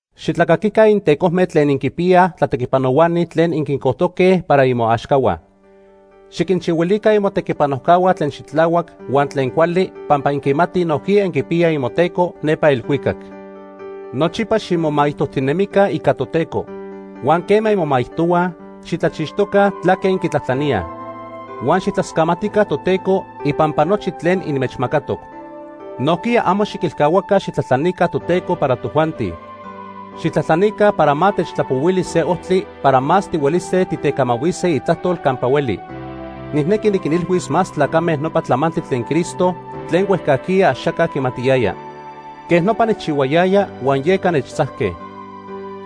Xitlacaquica intecojme tlen inquinpiyaj tlatequipanohuani tlen inquincojtoque para imoaxcahua. Xiquinchihuilica imotequipanojcahua tlen xitlahuac huan tlen cuali pampa inquimatij nojquiya inquipiyaj imoTeco nepa elhuicac. Nochipa ximomaijtojtinemica ica Toteco. Huan quema inmomaijtohuaj, xitlachixtoca tlaque inquitlajtlaníaj. Huan xijtlascamatica Toteco ipampa nochi tlen inmechmacatoc. Nojquiya amo xiquilcahuaca xijtlajtlanica Toteco para tojuanti. Xijtlajtlanica para ma techtlapohuili se ojtli para más tihuelise titecamahuise Itlajtol campa hueli. Nijnequi niquinilhuis más tlacame nopa tlamantli tlen Cristo tlen huejcajquiya axaca quimatiyaya. Quejnopa nijchihuayaya huan yeca nechtzajque.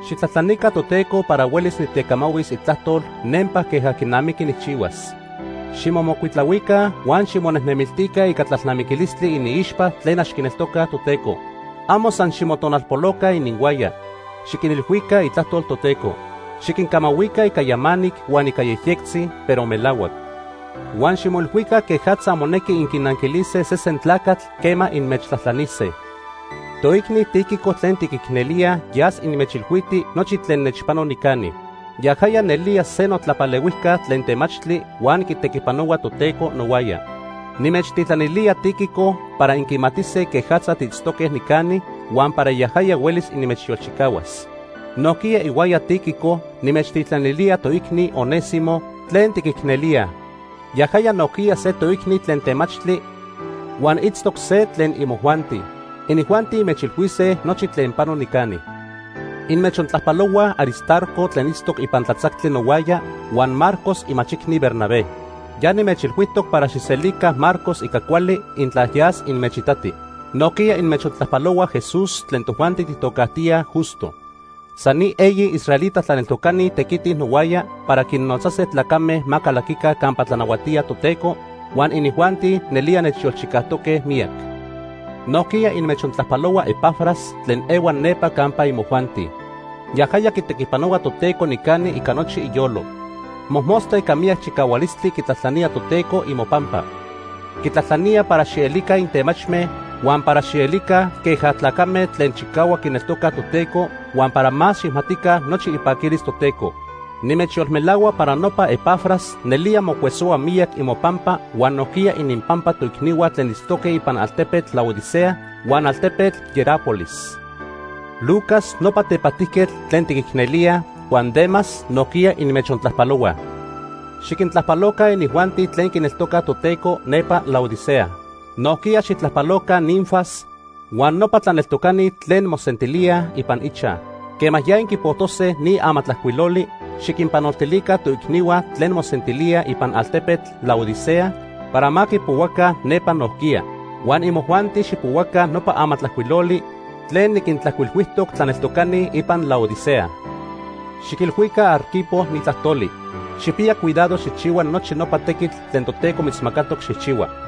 Xijtlajtlanica Toteco para huelis nitecamahuis Itlajtol nempa queja quinamiqui nijchihuas. Ximomocuitlahuica huan ximonejnemiltica ica tlalnamiquilistli iniixpa tlen ax quineltocaj Toteco. Amo san ximotonalpoloca ininhuaya. Xiquinilhuica Itlajtol Toteco. Xiquincamahuica ica yamanic huan ica yejyectzi, pero melahuac. Huan ximoilhuica quejatza monequi inquinanquilise sesen tlacatl quema inmechtlajtlanise. Toicni Tíquico tlen tiquicnelíaj yas inmechilhuiti nochi tlen nechpano nicani. Yajaya nelía se notlapalehuijca tlen temachtli huan quitequipanohua Toteco nohuaya. Nimechtitlanilía Tíquico para inquimatise quejatza tiitztoque nicani huan para yajaya huelis inmechyolchicahuas. Nojquiya ihuaya Tíquico nimechtitlanilía toicni Onésimo tlen tiquicnelíaj. Yajaya nojquiya se toicni tlen temachtli huan itztoc se tlen imojuanti. Inijuanti inmechilhuise nochi tlen pano nicani. Inmechtlajpalohuaj Aristarco tlen itztoc ipan tlatzactli nohuaya huan Marcos imachicni Bernabé. Ya nimechilhuijtoc para xijselica Marcos ica cuali intla yas inmechitati. Nojquiya inmechtlajpalohua Jesús tlen tojuanti tijtocajtíaj Justo. San ni eyi israelita tlaneltocani tequitij nohuaya para quinnotzase tlacame ma calaquica campa tlanahuatía Toteco, huan inijuanti nelía nechyolchicajtoque miyac. Nojquiya inmechtlajpalohua Epafras tlen ehua nepa campa imojuanti. Yajaya quitequipanohua Toteco nicani ica nochi iyolo. Mojmostla ica miyac chicahualistli quitlajtlanía Toteco imopampa. Quitlajtlanía para xielica intemachme, huan para xielica queja tlacame tlen chicahuac quineltoca Toteco huan para ma xijmatica nochi ipaquilis Toteco. Nimechyolmelahua para nopa Epafras nelía mocuesohua miyac imopampa huan nojquiya ininpampa toicnihua tlen itztoque ipan altepetl Laodicea huan altepetl Hierápolis. Lucas, nopa tepajtijquetl tlen tiquicnelíaj, huan Demas nojquiya inmechontlajpalohuaj. Xiquintlajpaloca inijuanti tlen quineltocaj Toteco nepa Laodicea. Nojquiya xijtlajpaloca Ninfas huan nopa tlaneltocani tlen mosentilíaj ipan ichaj. Quema ya inquipojtose ni amatlajcuiloli, xiquinpanoltilica toicnihua tlen mosentilíaj ipan altepetl Laodicea para ma quipohuaca nepa nojquiya. Huan imojuanti xijpohuaca nopa amatlajcuiloli tlen niquintlajcuilhuijtoc tlaneltocani ipan Laodicea. Xiquilhuica Arquipo ni tlajtoli: “Xijpiya cuidado xijchihua nochi nopa tequitl tlen Toteco mitzmacatoc xijchihua.”